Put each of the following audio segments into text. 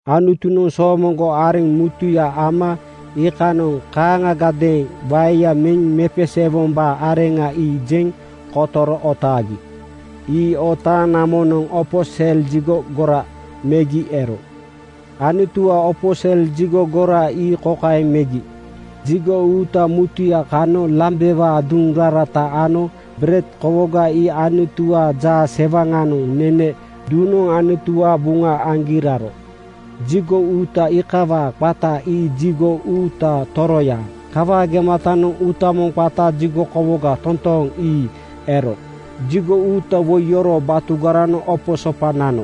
Anutunoŋ soomoŋgo areŋ mutuya ama iikanoŋ kaaŋagadeeŋ waeya meŋ mepeseewombaa areŋa ii jeŋ kotoro otaagi. Ii otaaŋ namonoŋ opo sel jigo gora megi ero. Anutuwaa opo sel jigo gora ii kokaeŋ megi: Jigo uuta mutuya kanoŋ lambewaa duŋ rarata ano bered kowoga ii Anutuwaa jaasewaŋanoŋ nene duŋnoŋ Anutuwaa buŋa aŋgi raro. Jigo uuta iikawaa qata ii jigo uuta toroya Kawaa gematanoŋ uuta moŋ qata jigo kowoga totooŋ ii ero. Jigo uuta woi yoroo batugaranoŋ opo sopa nano.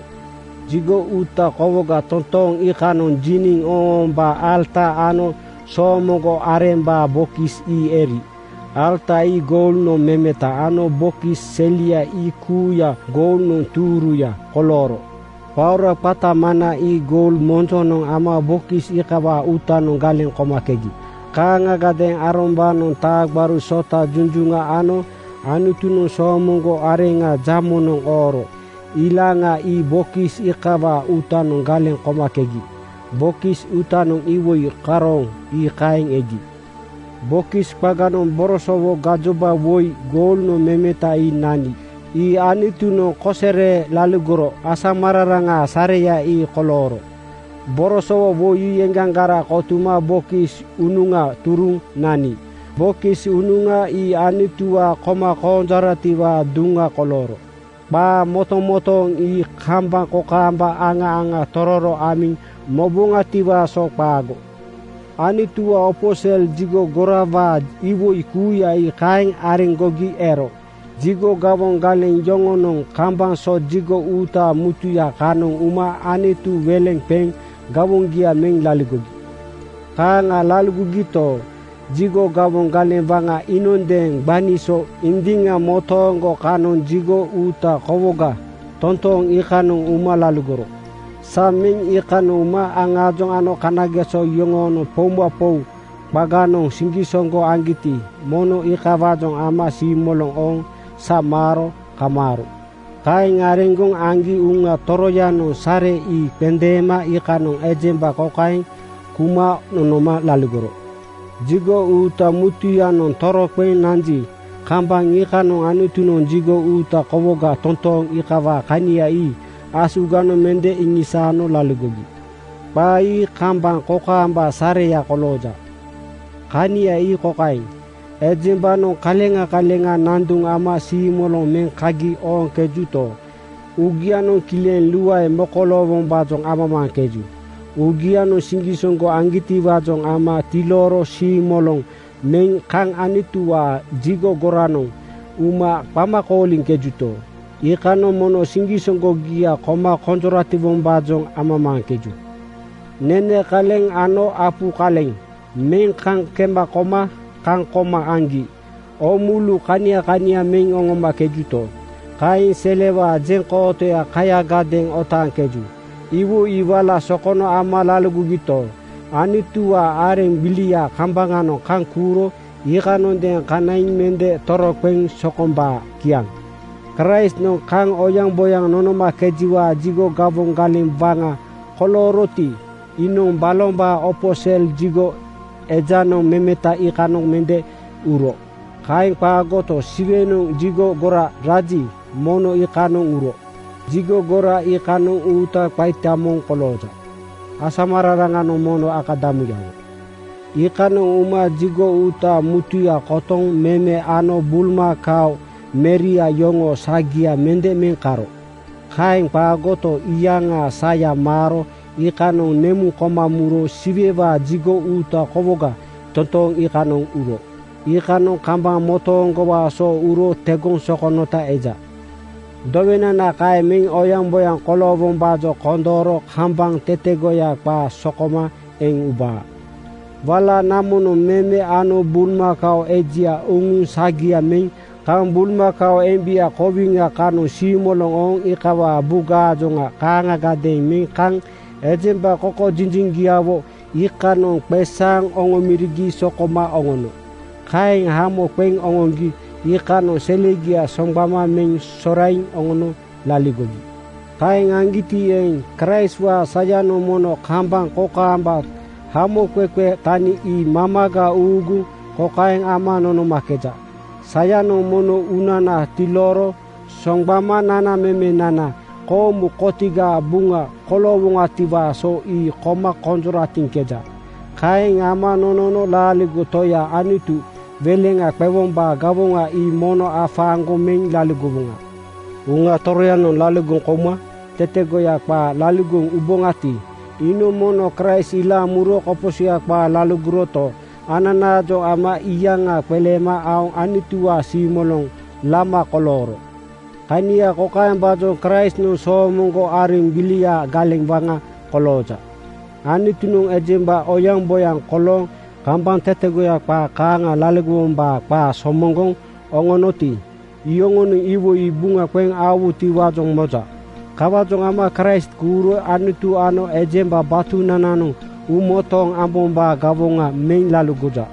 Jigo uuta kowoga totooŋ iikanoŋ jiniŋ ooŋoombaa alata ano soomoŋgo arembaa bokis ii eri. Alata ii goulnoŋ memeta ano bokis selia ii kuuya goulnoŋ tuuruya kolooro. Paora qata mana ii goul monjonoŋ ama bokis iikawaa uutanoŋ galeŋ komakegi. Kaaŋagadeeŋ Aarombaanoŋ taa gbaru sota junjuŋa ano Anutunoŋ soomoŋgo areŋa jamonoŋ ooro ilaŋa ii bokis iikawaa uutanoŋ galeŋ komakegi. Bokis uutanoŋ iwoi karooŋ ii kaeŋ egi. Bokis qaganoŋ borosowo gajoba woi goulnoŋ memeta ii nani. Ii Anutunoŋ kosere laligoro asamararaŋaa sareya ii kolooro. Borosowo woi ii eŋgaŋgara kotuma bokis unuŋa turuŋ nani. Bokis unuŋa ii Anutuwaa koma konjoratiwaa duŋa kolooro. Qaa motomotooŋ ii kambaŋ kokaamba aŋa aŋa tororo amiŋ moboŋatiwaa so qaago. Anutuwaa opo sel jigo gorawaa iwoi kuuya ii kaeŋ areŋgogi ero jigo gawoŋ galeŋ yoŋonoŋ kambaŋ so jigo uuta mutuya kanoŋ uma Anutu weleŋa qeŋ gawoŋgia meŋ laligogi. Kaaŋa laligogito, jigo gawoŋ galeŋ waŋa iinondeeŋ gbani so indiŋa motooŋgo kanoŋ jigo uuta kowoga totooŋ iikanoŋ uma laligoro. Sa meŋ iikanoŋ uma aŋaajoŋ ano kanageso yoŋonoŋ poumapou qaganoŋ siŋgisoŋgo aŋgiti, mono iikawaajoŋ ama siimoloŋ ooŋ sa maaro kamaaro. Kaeŋ areŋgoŋ aŋgi Uŋa Toroyanoŋ sare ii qendeema iikanoŋ ejemba kokaeŋ kuma nonoma laligoro: Jigo uuta mutuyanoŋ toroqeŋ nanji, kambaŋ iikanoŋ Anutunoŋ jigo uuta kowoga totooŋ iikawaa kania ii asuganoŋ mende iŋisaano laligogi. Qaa ii kambaŋ kokaambaa sareya kolooja. Kania ii kokaeŋ: Ejembanoŋ kaleŋa kaleŋa nanduŋ ama siimoloŋ meŋ kagi ooŋkejuto, uugianoŋ kileŋ luae mokoloowombaajoŋ amamaaŋkeju. Uugianoŋ siŋgisoŋgo aŋgitiwaajoŋ ama tilooro siimoloŋ meŋ kaŋ Anutuwaa jigo goranoŋ uma qama kooliŋkejuto, iikanoŋ mono siŋgisoŋgogia koma konjoratiwombaajoŋ amamaaŋkeju. Nene kaleŋ ano apu kaleŋ meŋ kaŋ kema koma kaŋ koma aŋgi oomulu kania kania meŋ oŋomakejuto, kaeŋ selewaa jeŋkootoya kayagadeeŋ otaaŋkeju. Iwoi ii wala sokono ama laligogito, Anutuwaa areŋ gbiliaa kambaŋanoŋ kaŋ kuuro iikanondeeŋ kanaiŋ mende toroqeŋ sokombaa. Kiaŋ. Kraistnoŋ kaŋ oyaŋboyaŋ nonomakejiwaa jigo gawoŋ galeŋ waŋa kolooroti, iinoŋ balombaa opo sel jigo ejanoŋ memeta iikanoŋ mende uro. Kaeŋ qaagoto, Siwenoŋ jigo gora raji, mono iikanoŋ uro. Jigo gora iikanoŋ uuta qaita moŋ kolooja. Asamararaŋanoŋ mono akadamuyawo. Iikanoŋ uma jigo uuta mutuya kotoŋ meme ano bulmakao meria yoŋoo sagia mende meŋ keno. Kaeŋ qaagoto, iyaŋaa saya maaro iikanoŋ nemuŋ koma muro Siwewaa jigo uuta kowoga totooŋ iikanoŋ uro. Iikanoŋ kambaŋ motooŋgowaa so uro tegoŋ sokonota eja. Dowenana kaeŋ meŋ oyaŋboyaŋ koloowombaajoŋ kondooro kambaŋ tetegoya qaa sokoma eŋ ubaa. Wala namonoŋ meme ano bulmakao ejia uŋuŋ sagia meŋ kaŋ bulmakao embia kowiŋa kanoŋ siimoloŋ ooŋ iikawaa bugaajoŋa kaaŋagadeeŋ meŋ kaŋ ejemba kokojinjiŋgiawo iikanoŋ qeesaaŋ oŋomorigi sokoma oŋono. Kaeŋ hamo qeŋ oŋoŋgi iikanoŋ selegia soŋgbama meŋ soraiŋ oŋono laligogi. Kaeŋ aŋgiti eeŋ, Kraistwaa sayanoŋ mono kambaŋ kokaamba hamoqeqe tani ii mamaga uuguŋ kokaeŋ ama nonomakeja: Sayanoŋ mono uunana tilooro soŋgbama nanamemenana koomu kotigaa buŋa koloowoŋatiwaa so ii koma konjoratiŋkeja. Kaeŋ ama nonono laaligo Toya Anutu weleŋa qewombaa gawoŋa ii mono afaaŋgoŋ meŋ laligowoŋa. Uŋa Toroyanoŋ laligoŋ kouma tetegoya qaa laligoŋ ubaati, iinoŋ mono Kraist ilaaŋ muro koposoya qaa laligoroto, ananaajoŋ ama iyaŋa qeleema aoŋ Anutuwaa siimoloŋ lama kolooro. Kania kokaembaajoŋ Kraistnoŋ soomoŋgo areŋ gbiliaa galeŋ waŋa kolooja: Anutunoŋ ejemba oyaŋboyaŋ kolooŋ kambaŋ tetegoya qaa kaaŋa laligowombaa qaa somoŋgoŋ oŋoonoti, iyoŋonoŋ iwoi ii buŋa qeŋ aowutiwaajoŋ moja. Kawaajoŋ ama Kraist kuuro Anutu ano ejemba batunananoŋ uumotooŋ ambombaa gawoŋa meŋ laligoja.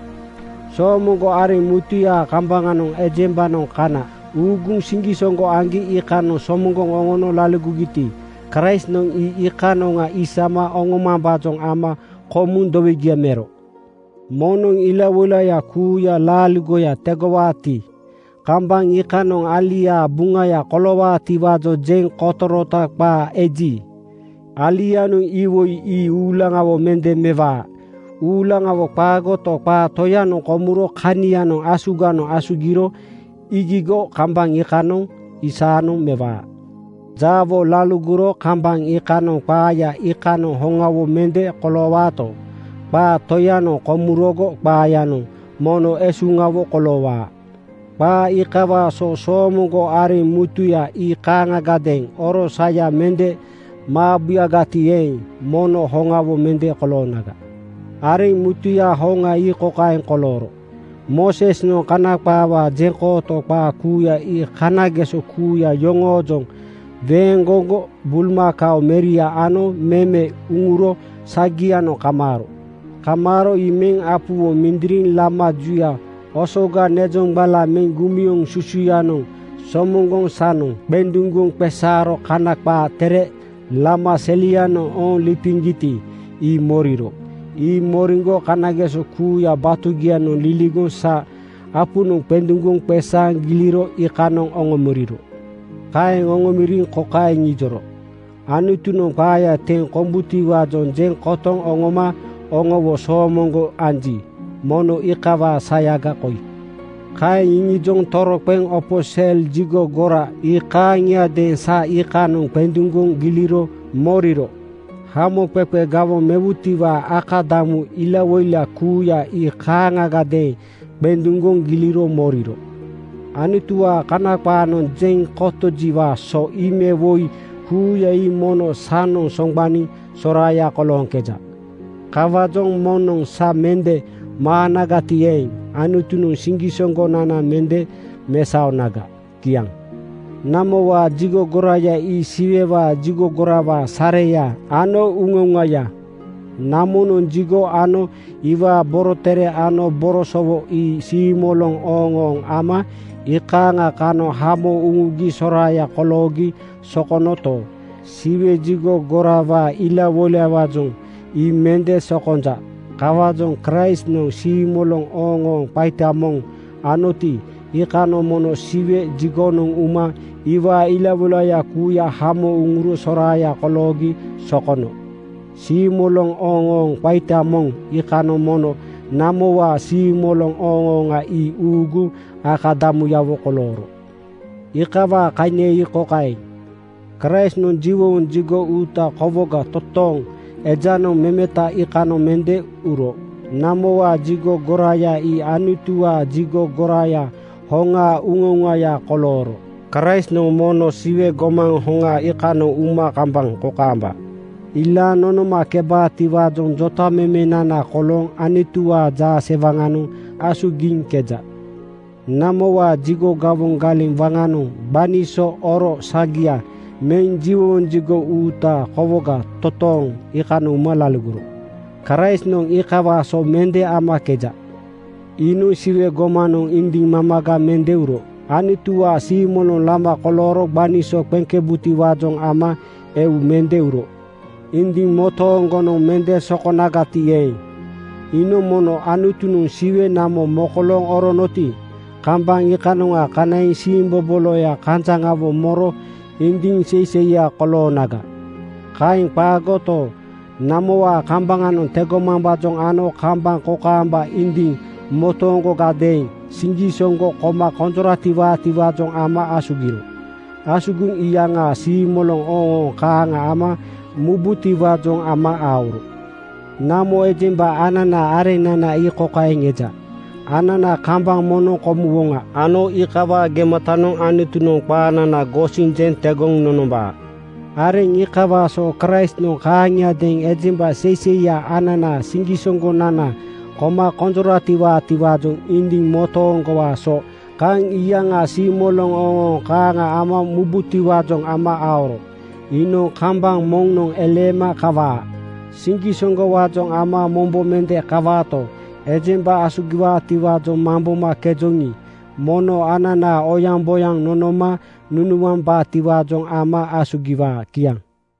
Soomoŋgo areŋ mutuyaa kambaŋanoŋ ejembanoŋ kana uuguŋ siŋgisoŋgo aŋgi iikanoŋ somoŋgoŋ oŋono laligogiti, Kraistnoŋ ii iikanoŋa isama oŋomambaajoŋ ama komuŋ dowegia mero. Moŋnoŋ ilawoilaya kuuya laaligoya tegowaati, kambaŋ iikanoŋ aliaa buŋaya koloowaatiwaajoŋ jeŋ kotorota qaa eji, alianoŋ iwoi ii uulaŋawo mende mewaa. Uulaŋawo qaagoto, qaa toyanoŋ komuro kanianoŋ asuganoŋ asugiro iigigo kambaŋ iikanoŋ ii saanoŋ mewaa. Jaawo laligoro kambaŋ iikanoŋ qaaya iikanoŋ hoŋawo mende koloowaato, qaa toyanoŋ komurogo qaayanoŋ mono esuŋawo koloowaa. Qaa iikawaa so soomoŋgo areŋ mutuya ii kaaŋagadeeŋ oro saya mende maabuyagati eeŋ, mono hoŋawo mende koloonaga. Areŋ mutuyaa hoŋa ii kokaeŋ kolooro: Moosesnoŋ Kana qaawaa jeŋkooto qaa kuuya ii kanageso kuuya yoŋoojoŋ weeŋgoŋgo bulmakao meria ano meme uŋuro sagianoŋ kamaaro. Kamaaro ii meŋ apuwo mindiriŋ lama juya osoga nezoŋgbala meŋ gumioŋ susuyanoŋ somoŋgoŋ sanoŋ qenduŋgoŋ qeesaaro Kana qaa Tere lama selianoŋ ooŋ lipiŋgiti, ii moriro. Ii moriŋgo kanageso kuuya batugianoŋ liligoŋ sa apunoŋ qenduŋgoŋ qeesaaŋ giliro iikanoŋ oŋomoriro. Kaeŋ oŋomoriŋ kokaeŋ iŋijoro, “Anutunoŋ qaaya teŋ kombutiwaajoŋ jeŋ kotoŋ oŋoma oŋowo soomoŋgo anji, mono iikawaa sayaga koi.” Kaeŋ iŋijoŋ toroqeŋ opo sel jigo gora ii kaaŋiadeeŋ sa iikanoŋ qenduŋgoŋ giliro moriro. Hamoqeqe gawoŋ mewutiwaa akadamu ilawoila kuuya ii kaaŋagadeeŋ qenduŋgoŋ giliro moriro. Anutuwaa Kana qaanoŋ jeŋ kotojiwaa so ii me woi kuuya ii mono sanoŋ soŋgbaniŋ soraaya kolooŋkeja. Kawaajoŋ moŋnoŋ sa mende maanagati eeŋ, Anutunoŋ siŋgisoŋgonana mende mesaonaga. Kiaŋ. Namowaa jigo goraya ii Siwewaa jigo gorawaa sareya ano uŋauŋaya. Namonoŋ jigo ano iwaa borotere ano borosowo ii siimoloŋ ooŋooŋ ama iikaaŋa kanoŋ hamo uŋugi soraaya koloogi sokonoto, Siwe jigo gorawaa ilawoilawaajoŋ ii mende sokonja. Kawaajoŋ Kraistnoŋ siimoloŋ ooŋooŋ qaita moŋ anoti, iikanoŋ mono Siwe jigonoŋ uma iwaa ilawoilaya kuuya hamo uŋuro soraaya koloogi sokono. Siimoloŋ ooŋooŋ qaita moŋ iikanoŋ mono namowaa siimoloŋ ooŋooŋa ii uuguŋ akadamuyawo kolooro. Iikawaa kania ii kokaeŋ: Kraistnoŋ jiwowoŋ jigo uuta kowoga totooŋ ejanoŋ memeta iikanoŋ mende uro. Namowaa jigo goraya ii Anutuwaa jigo goraya hoŋaa uŋauŋaya kolooro. Kraistnoŋ mono Siwe gomaŋ hoŋa iikanoŋ uma kambaŋ kokaamba ilaaŋ nonomakebaatiwaajoŋ jotamemenana kolooŋ Anutuwaa jaasewaŋanoŋ asugiŋkeja. Namowaa jigo gawoŋ galeŋ waŋanoŋ gbani so oro sagia meŋ jiwowoŋ jigo uuta kowoga totooŋ iikanoŋ uma laligoro. Kraistnoŋ iikawaa so mende amakeja. Iinoŋ Siwe gomanoŋ indiŋ mamaga mende uro. Anutuwaa siimoloŋ lama kolooro gbani so qeŋkebutiwaajoŋ ama eu mende uro. Indiŋ motooŋgonoŋ mende sokonagati eeŋ, iinoŋ mono Anutunoŋ Siwe namo mokolooŋ oronoti, kambaŋ iikanoŋa kanaiŋ siimboboloya kanjaŋawo moro indiŋ seiseiya koloonaga. Kaeŋ qaagoto, namowaa kambaŋanoŋ tegomambaajoŋ ano kambaŋ kokaamba indiŋ motooŋgogadeeŋ siŋgisoŋgo koma konjoratiwaatiwaajoŋ ama asugiro. Asugiŋ iyaŋa siimoloŋ ooŋooŋ kaaŋa ama mubutiwaajoŋ ama aoro. Namo ejemba ananaa areŋnana ii kokaeŋ eja: Anana kambaŋ moŋnoŋ komuwoŋa ano iikawaa gematanoŋ Anutunoŋ qaanana gosiŋ jeŋ tegoŋ nonombaa. Areŋ iikawaa so Kraistnoŋ kaaŋiadeeŋ ejemba seiseiya ananaa siŋgisoŋgonana koma konjoratiwaatiwaajoŋ indiŋ motooŋgowaa so kaŋ iyaŋa siimoloŋ ooŋooŋ kaaŋa ama mubutiwaajoŋ ama aoro. Iinoŋ kambaŋ moŋnoŋ eleema kawaa. Siŋgisoŋgowaajoŋ ama mombo mende kawaato, ejemba asugiwaatiwaajoŋ mambomakejoŋi, mono anana oyaŋboyaŋ nonoma nunuambaatiwaajoŋ ama asugiwaa. Kiaŋ.